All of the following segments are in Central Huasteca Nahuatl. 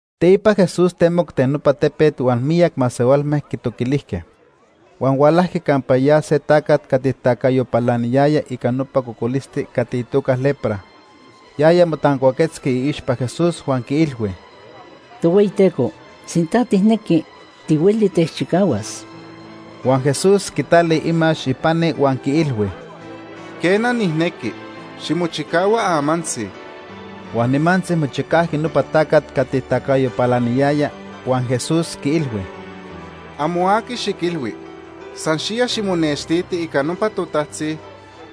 Teipa Jesús temoc ten nopa tepet huan miyac masehualme quitoquilijque. Huan hualajqui campa ya se tacat cati tacayo palaniyaya ica nopa cocolisti cati itoca lepra. Yaya motancuaquetzqui iixpa Jesús huan quiilhui: ―Tohueyiteco sinta tijnequi, tihueli techchicahuas. Huan Jesús quitali imax ipani huan quiilhui: ―Quena, nijnequi. Ximochicahua amantzi. Huan nimantzi mochicajqui nopa tacat cati tacayo palaniyaya. Huan Jesús quiilhui: ―Amo aqui xiquilhui. San xiya ximonextiti ica nopa totajtzi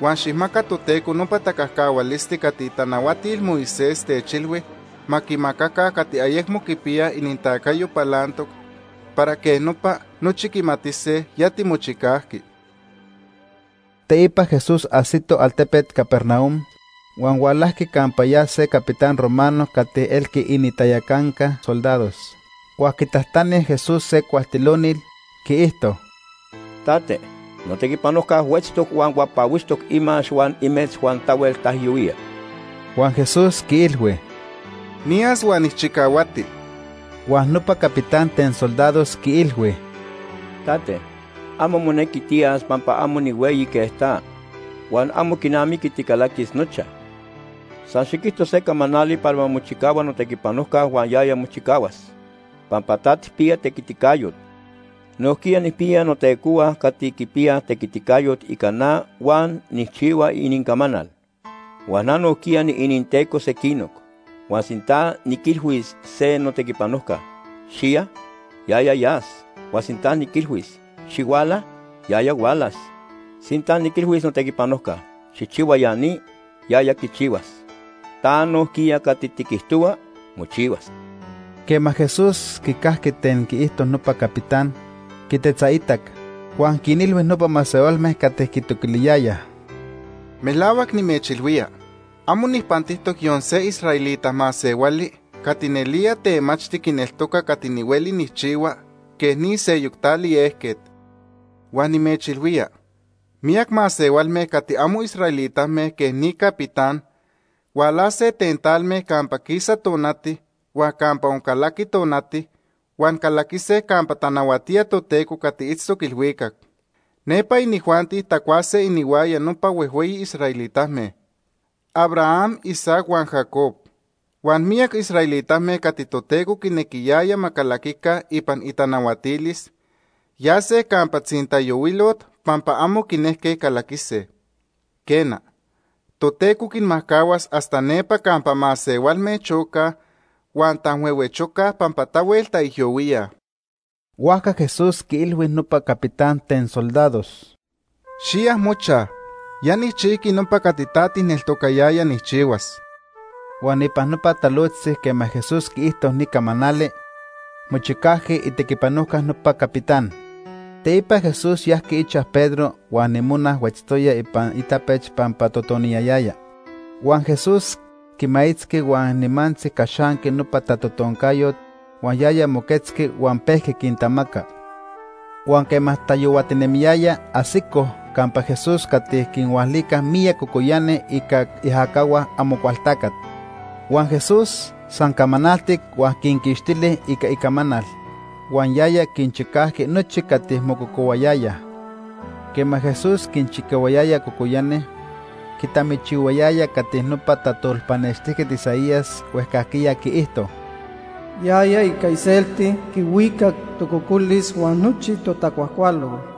huan xijmaca Toteco nopa tacajcahualisti cati itanahuatil Moisés techilhui ma quimacaca cati ayecmo quipiyaj inintacayo palantoc para quej nopa nochi quimatise ya timochicajqui. Teipa Jesús ajsito altepet Capernaum, huan hualajqui campa ya se capitán romano cati elqui inintayacanca soldados. Huan quitajtani Jesús se cualtilonil, quiijto: ―Tate, notequipanojca huetztoc huan huapahuixtoc imax huan imetz huan tahuel taijyohuía. Huan Jesús quiilhui: ―Niyas huan nijchicahuati. Huan nopa capitán ten soldados quiilhui: ―Tate, amo monequi tiyas pampa amo nihueyi quej ta, huan amo quinamiqui ticalaquis nochaj. San xiquijto se camanali para ma mochicahua notequipanojca huan yaya mochicahuas, pampa ta tijpiya tequiticayot Nojquiya nijpiya notecohua cati quipiyaj tequiticayot ica na huan nijchihua inincamanal. Huan na nojquiya niininteco sequinoc. Huan sinta niquilhuis se notequipanojca: ‘Xiya’, yaya yas, huan sinta niquilhuis: ‘Xihuala’, yaya hualas. Sinta niquilhuis notequipanojca: ‘Xijchihua ya ni’, yaya quichihuas. Ta nojquiya cati tiquijtohua, mochihuas. Quema Jesús quicajqui ten quiijto nopa capitán, quitetzaitac, huan quinilhui nopa masehualme cati quitoquiliyayaj: ―Melahuac nimechilhuía, amo nijpantijtoc yon se israelita masehuali cati nelía temachti quineltoca cati nihueli nijchihua quej ni seyoc tali ejquet. Huan nimechilhuía, miyac masehualme cati amo israelitame quej ni capitán hualase ten talme campa quisa tonati huan campa oncalaqui tonati huan calaquise campa tanahuatía Toteco cati itztoc ilhuicac. Nepa inijuanti tacuase inihuaya nopa huejhueyi israelitame: Abraham, Isaac huan Jacob. Huan miyac israelitame cati Toteco quinequiyaya ma calaquica ipan itanahuatilis, yase campa tzintayohuilot pampa amo quinejque calaquise. Quena, Toteco quinmajcahuas hasta nepa campa masehualme chocaj huan tanhuehuechocaj pampa tahuel taijyohuíaj. Huajca Jesús quiilhui nopa capitán ten soldados: ―Xiya mochaj. Ya nijchijqui nopa cati ta tijneltocayaya nijchihuas. Huan ipan nopa talojtzi quema Jesús quiijto ni camanali, mochicajqui itequipanojca nopa capitán. Teipa Jesús yajqui ichaj Pedro huan imona huetztoya ipan itapech pampa totoniyayaya. Huan Jesús quimaitzqui huan nimantzi caxanqui nopa tatotoncayot huan yaya moquetzqui huan pejqui quintamaca. Huan quema tayohuatinemiyaya, ajsicoj campa Jesús cati quinhualicaj miyac cocoyani ica iajacahua Amocualtacat. Huan Jesús san camanaltic huan quinquixtili ica icamanal. Huan yaya quinchicajqui nochi cati mococohuayayaj. Quema Jesús quinchicahuayaya cocoyani, quitamichihuayaya cati nopa tajtolpanextijquet Isaías huejcajquiya quiijto: “Yaya ica iselti quihuicac tococolis huan nochi totacuajcualol.”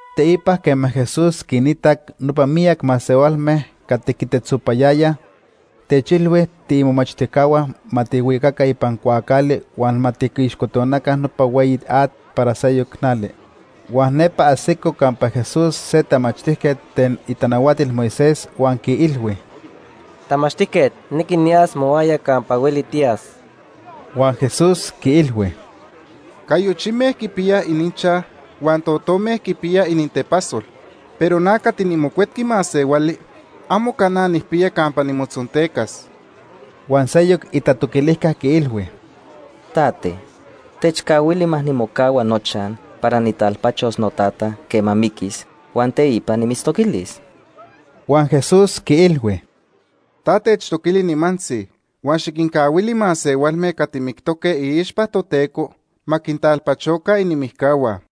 Teipa quema Jesús quinitac nopa miyac masehualme cati quitetzopayayaj, techilhui tiimomachtijcahua ma tijhuicaca ipan cuaacali huan ma tiquixcotonaca nopa hueyi at para seyoc nali. Huan nepa ajsico campa Jesús se tamachtijquet ten itanahuatil Moisés huan quiilhui: ―Tamachtijquet, nijnequi niyas mohuaya campa hueli tiyas. Huan Jesús quiilhui: ―Cayochime quipiyaj ininchaj huan totome quipiyaj inintepasol, pero na cati nimocuetqui Masehuali amo cana nijpiya campa nimotzontecas. Huan seyoc itatoquilijca quiilhui: ―Tate, techcahuili ma nimocahua nochaj para nijtalpachos notata quema miquis, huan teipa nimitztoquilis. Huan Jesús quiilhui: ―Ta techtoquili nimantzi, huan xiquincahuili masehualme cati mictoque iixpa Toteco ma quintalpachoca inimijcahua.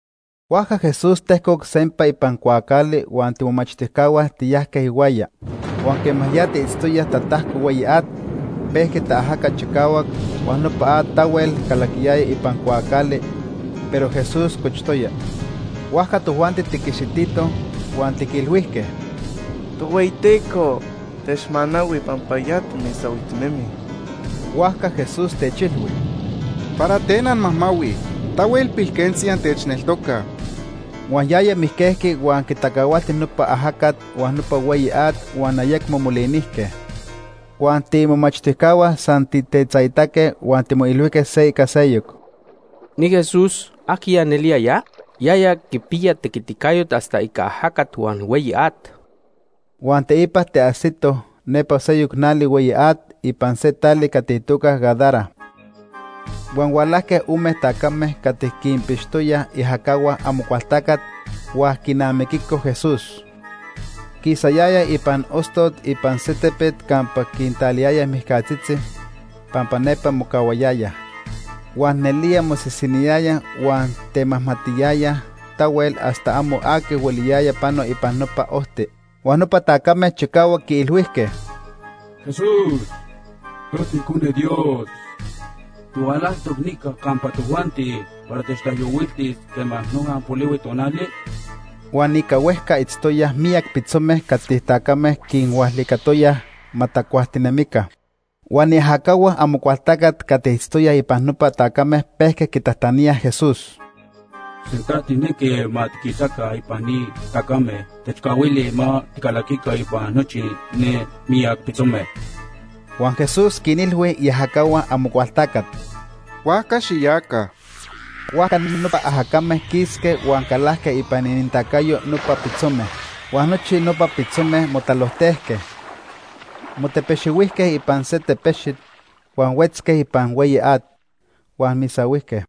Huajca Jesús tejcoc sempa ipan cuaacali huan tiimomachtijcahua tiyajque ihuaya. Huan quema ya tiitztoyaj tatajco hueyi at, pejqui taajaca chicahuac huan nopa at tahuel calaquiyaya ipan cuaacali, pero Jesús cochtoya. Huajca tojuanti tiquixititoj huan tiquilhuijque: ―Tohueyiteco, techmanahui pampa ya timisahuijtinemij. Huajca Jesús techilhui: ―¿Para ten anmajmahuij? Tahuel pilquentzi antechneltocaj. Huan yaya mijquejqui huan quitacahualti nopa ajacat huan nopa hueyi at huan ayecmo molinijque. Huan tiimomachtijcahua san tijtetzaitaque huan timoilhuijque se ica seyoc: ―Ni Jesús, ¿ajquiya nelía ya? Yaya quipiya tequiticayot hasta ica ajacat huan hueyi at. Huan teipa tiajsitoj nepa seyoc nali hueyi at ipan se tali cati itoca Gadara. Huan hualajque ome tacame cati quinpixtoyaj iajacahua Amocualtacat huan quinamiquicoj Jesús. Quisayayaj ipan ostot ipan se tepet campa quintaliyayaj mijcatzitzi, pampa nepa mocahuayayaj. Huan nelía mosisiniyayaj huan temajmatiyayaj tahuel hasta amo aqui hueliyaya pano ipan nopa ojti. Huan nopa tacame chicahuac quiilhuijque: ―Jesús, ta tiIcone Dios. ¿Tihualajtoc nica campa tojuanti para techtaijyohuiltis quema noja polihui tonali? Huan ica huejca itztoyaj miyac pitzome cati tacame quinhualicatoyaj ma tacuajtinemica. Huan iajacahua Amocualtacat cati itztoyaj ipan nopa tacame pejque quitajtaníaj Jesús: ―Sinta tijnequi ma tiquistehuaca ipan ni tacame, techcahuili ma ticalaquica ipan nochi ne miyac pitzome. Huan Jesús quinilhui iajacahua Amocualtacat: ―Huajca xiyaca. Huajca nopa ajacame quisque huan calajque ipan inintacayo nopa pitzome. Huan nochi nopa pitzome motalojtejque. Motepexihuijque ipan se tepexit, huan huetzque ipan hueyi at, huan misahuijque.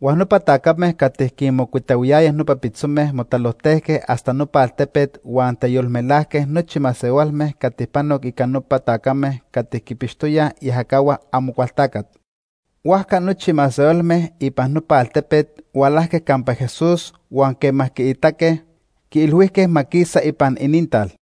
Huan nopa tacame cati quinmocuitahuiyayaj nopa pitzome motalojtejque hasta nopa altepet huan teyolmelajque nochi masehualme cati panoc ica nopa tacame cati quinpixtoyaj iajacahua Amocualtacat. Huajca nochi masehualme ipan nopa altepet hualajque campa Jesús huan quema quiitaque, quiilhuijque ma quisa ipan inintal.